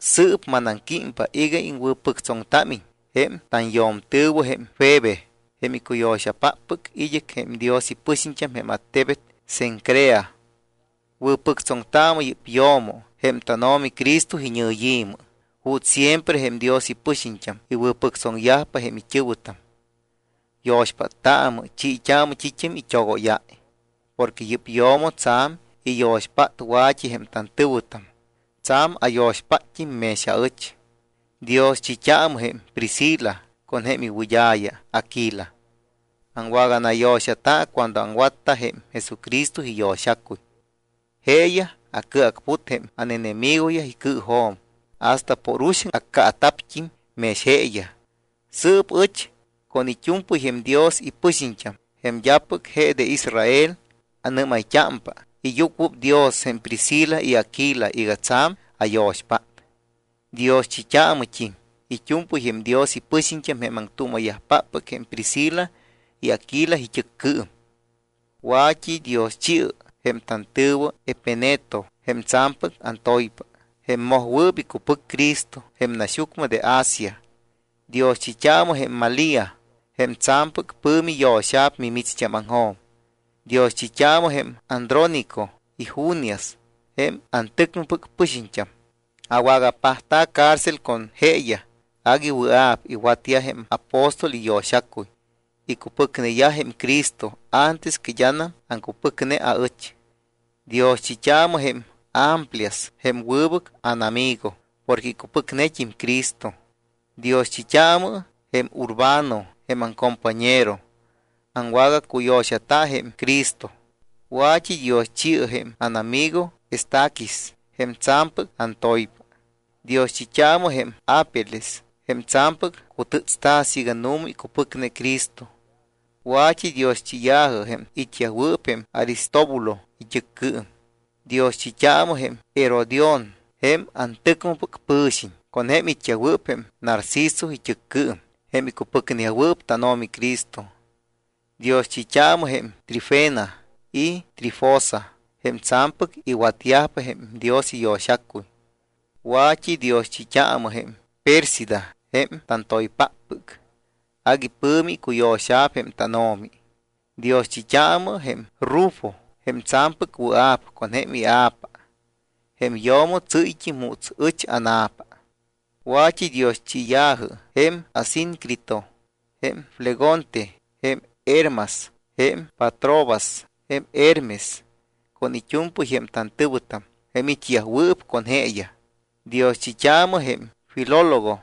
Sɨɨp manaŋquímpa iga iŋwɨ̱pɨctsoŋtámiñ jém tanyo̱mtɨ̱wɨ jém Febe, jém icuyo̱xapáppɨc id́ɨc jém Dios ipɨxiñt́am jém attebet Cencrea. Wɨ̱pɨctsoŋtaamɨ yɨ́p yo̱mo jém tánO̱mi Cristo iñɨyi̱mɨ juuts siempre jém Dios ipɨxiñt́am iwɨ̱pɨctsoŋyajpa jém it́ɨ̱wɨtam. Yo̱xpáttaamɨ, chiit́aamɨ t́it́am it́ogóyáy. Porque yɨ́p yo̱mo tsa̱m iyo̱xpát wa̱t́i jém tantɨ̱wɨtam, tsa̱m ayo̱xpátt́im mex aɨch. Dioschit́aamɨ jém Priscila con jém iwɨd́a̱ya Aquila. Aŋwaganayo̱xata cuando aŋwatta jém Jesucristo iyo̱xacuy. Jeeyaj acɨacput jém ánenemigoyaj icɨɨjo̱m hasta por uxaŋ accaata̱pt́im mex jeeyaj. Sɨɨp ɨch, con it́u̱mpɨy jém Dios ipɨxiñt́am, jém d́apɨc je de Israel, annɨ́mayt́ámpa iyucuɨpdios jém Priscila y Aquila iga tsa̱m ayo̱xpát. Dioschit́aamɨt́im it́u̱mpɨy jém Dios ipɨxiñt́am jém aŋtuuma̱yajpáppɨc jém Priscila y Aquila it́ɨccɨɨm. Wa̱t́idioschi̱ɨ jém tantɨ̱wɨ Epeneto, jém tsa̱mpɨc antoypa, jém mojwɨɨp icupɨc Cristo jém naxyucmɨ de Asia. Dioschit́aamɨ jém Malía, jém tsa̱mpɨc pɨ̱mi yo̱xa̱p mimicht́ámaŋjo̱m. Dioschit́aamɨ jém Andrónico y Junias jém antɨcmɨpɨc pɨxiñt́am. Awagapajtamta̱ cárcel con jeeyaj. Agui wɨa̱p iwatyaj jém apóstol iyo̱xacuy. Icupɨcneyaj jém Cristo antes que d́anam aŋcupɨcne aɨch. Dioschit́aamɨ jém Amplias jém wɨbɨc ánamigo porque icupɨcnet́im Cristo. Dioschit́aamɨ jém Urbano jém aŋcompañero, aŋwagacuyo̱xata jém Cristo. Wa̱t́idioschi̱ɨ jém ánamigo Estaquis, jém tsa̱mpɨc antoypa. Dioschit́aamɨ jém Apeles jém tsa̱mpɨc cutɨ́tsta̱ siiga nu̱ma icupɨcne Cristo. Wa̱t́idioschiya̱jɨ jém it́yajwɨɨp jém Aristóbulo it́ɨccɨɨm. Dioschit́aamɨ jém Herodión, jém antɨcmɨpɨc pɨ̱xiñ, con jém it́yajwɨɨp jém Narcisco it́ɨccɨɨm, jém icupɨcneyajwɨɨp tánO̱mi Cristo. Dioschit́aamɨ jém Trifena y Trifosa, jém tsa̱mpɨc iwatyajpa jém Dios iyo̱xacuy. Wa̱t́idioschit́aamɨ jém Pérsida jém tantoypáppɨc. Agui pɨ̱mi icuyo̱xa̱p jém tánO̱mi. Dioschit́aamɨ jém Rufo jém tsa̱mpɨc wɨa̱p con jém ia̱pa. Jém yo̱mo tsɨ́yt́im juuts ɨch ána̱pa. Wa̱t́idioschiya̱jɨ jém Asíncrito, jém Flegonte, jém Hermas, jém Patrobas, jém Hermes con it́u̱mpɨy jém tantɨ̱wɨtam jém it́yajwɨɨp con jeeyaj. Dioschit́aamɨ jém Filólogo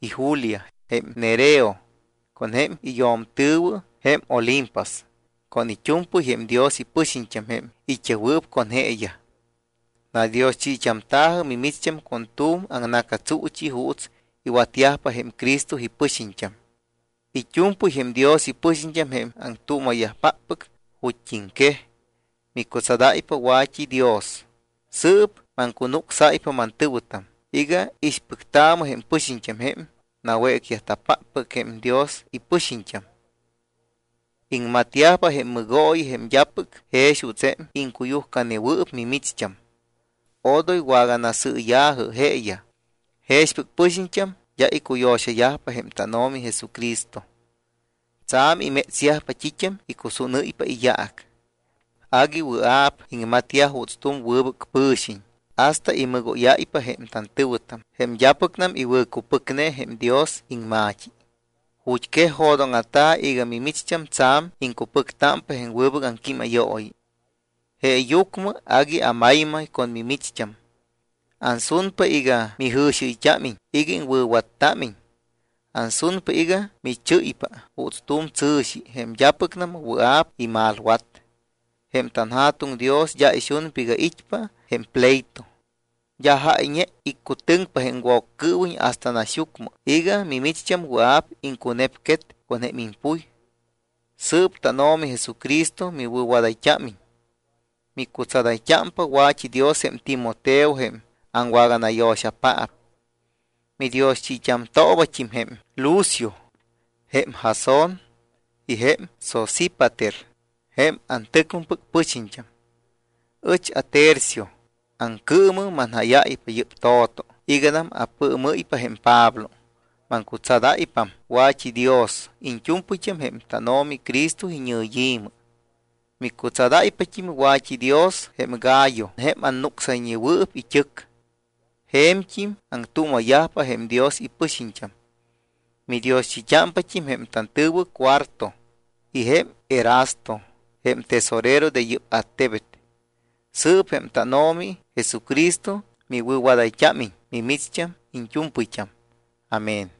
y Julia, jém Nereo con jém iyo̱mtɨ̱wɨ, jém Olimpas con it́u̱mpɨy jém Dios ipɨxiñt́am jém it́yajwɨɨp con jeeyaj. Nadioschit́amta̱jɨ mimicht́am con tu̱m aŋna̱catsuuchi juuts iwatyajpa jém Cristo ipɨxiñt́am. It́u̱mpɨy jém Dios ipɨxiñt́am jém aŋtuuma̱yajpáppɨc ju̱t́iŋquej micutsadáypa wa̱t́idios. Sɨɨp maŋcunucsáypa, mantɨ̱wɨtam, iga ixpɨctaamɨ jém pɨxiñt́am jém nawécta̱páppɨc jém Dios ipɨxiñt́am. Iŋmatyajpa jém mɨgooyi jém d́apɨc jex juuts jém iŋcuyujcanewɨɨp mimicht́am. Odoy waganasɨɨya̱jɨ jeeyaj. Jexpɨc pɨxiñt́am d́a icuyo̱xayajpa jém tánO̱mi Jesucristo. Tsa̱m imétsyajpa t́it́am icusúnɨ́ypa iyaac. Agui wɨa̱p iŋmatyaj juuts tu̱m wɨbɨc pɨ̱xiñ hasta imɨgóyáypa jém tantɨ̱wɨtam, jém d́apɨcnam iwɨ̱cupɨcne jém Dios iŋma̱t́i. Ju̱t́ quej jo̱dóŋa̱ta̱ iga mimicht́am tsa̱m iŋcupɨctámpa jém wɨbɨc aŋquímayooyi. Jeeyucmɨ agui amaymay con mimicht́am. Ansunpa iga mijɨ̱xiɨyt́ámiñ iga iŋwɨ̱wattámiñ. Ansunpa iga michɨ́ypa juuts tu̱m tsɨ̱xi, jém d́apɨcnam wɨa̱p imalwat. Jém tanJa̱tuŋ Dios d́a ixunpa iga it́pa jém pleito. D́a jáyñe iccutɨŋpa jém Woccɨɨwiñ hasta naxyucmɨ iga micht́am wɨa̱p iŋcunepquet con jém impuy. Sɨɨp tánO̱mi Jesucristo miwɨ̱wadayt́ámiñ. Micutsadayt́ámpa wa̱t́idios jém Timoteo, jém aŋwaganayo̱xapaap. Midioschit́amtoobat́im jém Lucio, jém Jasón y jém Sosípater, jém antɨcmɨpɨc pɨxiñt́am. Ɨch aTercio, aŋcɨɨmɨ manjáyáypa yɨ́p to̱to iganam apɨɨmɨ́ypa jém Pablo. Maŋcutsadáypam wa̱t́idios iñt́u̱mpɨyt́am jém tánO̱mi Cristo iñɨyi̱mɨ. Micutsadáypat́im wa̱t́idios jém Gayo, jém anucsayñewɨɨp it́ɨc. Je̱mt́im aŋtuuma̱yajpa jém Dios ipɨxiñt́am. Midioschit́ámpat́im jém tantɨ̱wɨ Cuarto y jém Erasto, jém tesorero de yɨ́p attebet. Sɨɨp jém tánO̱mi Jesucristo miwɨ̱wadayt́ámiñ mimicht́am iñt́u̱mpɨyt́am. Amén.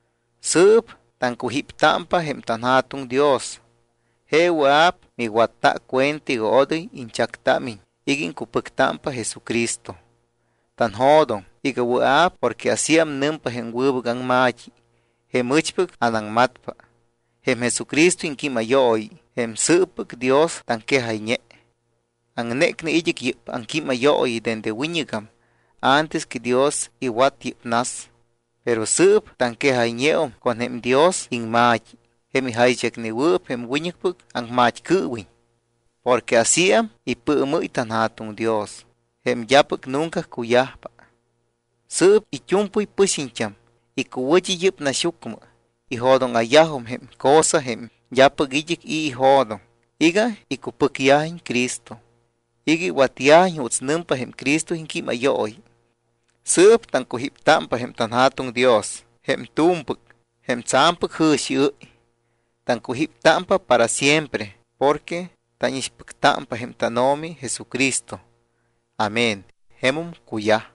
Sɨɨp taŋcujíptámpa jém tanJa̱tuŋ Dios. Je wɨa̱p miwatta cuenta iga odoy iñchactámiñ iga iŋcupɨctámpa Jesucristo. Tanjo̱doŋ iga wɨa̱p porque asíam nɨmpa jém wɨbɨc aŋma̱t́i, jém ɨchpɨc anaŋmatpa, jém Jesucristo iŋquímayooyi, jém sɨɨppɨc Dios taŋquejayñe. Aŋnécne id́ɨc yɨ́p aŋquímayooyi dende wiñɨgam antes que Dios iwat yɨ́p nas. Pero sɨɨp taŋquejayñeum con jém Dios iŋma̱t́i, jém ijaychacnewɨɨp jém wiñɨcpɨc aŋmat́cɨɨwiñ, porque asíam ipɨɨmɨ́y tanJa̱tuŋ Dios, jém d́apɨc nunca cuyajpa. Sɨɨp it́u̱mpɨy pɨxiñt́am icuwɨ̱t́i yɨ́p naxyucmɨ ijo̱dóŋa̱yajum jém cosa, jém d́apɨc id́ɨc i̱ ijo̱doŋ, iga icupɨcyajiñ Cristo, iga iwatyajiñ juuts nɨmpa jém Cristo iŋquímayooyi. Sɨɨp taŋcujíptámpa jém tanJa̱tuŋ Dios jém tu̱mpɨc, jém tsa̱mpɨc jɨ̱xiɨ́y. Taŋcujíptámpa para siempre porque tánixpɨctámpa jém tánO̱mi Jesucristo. Amén. Jemum cuyaj.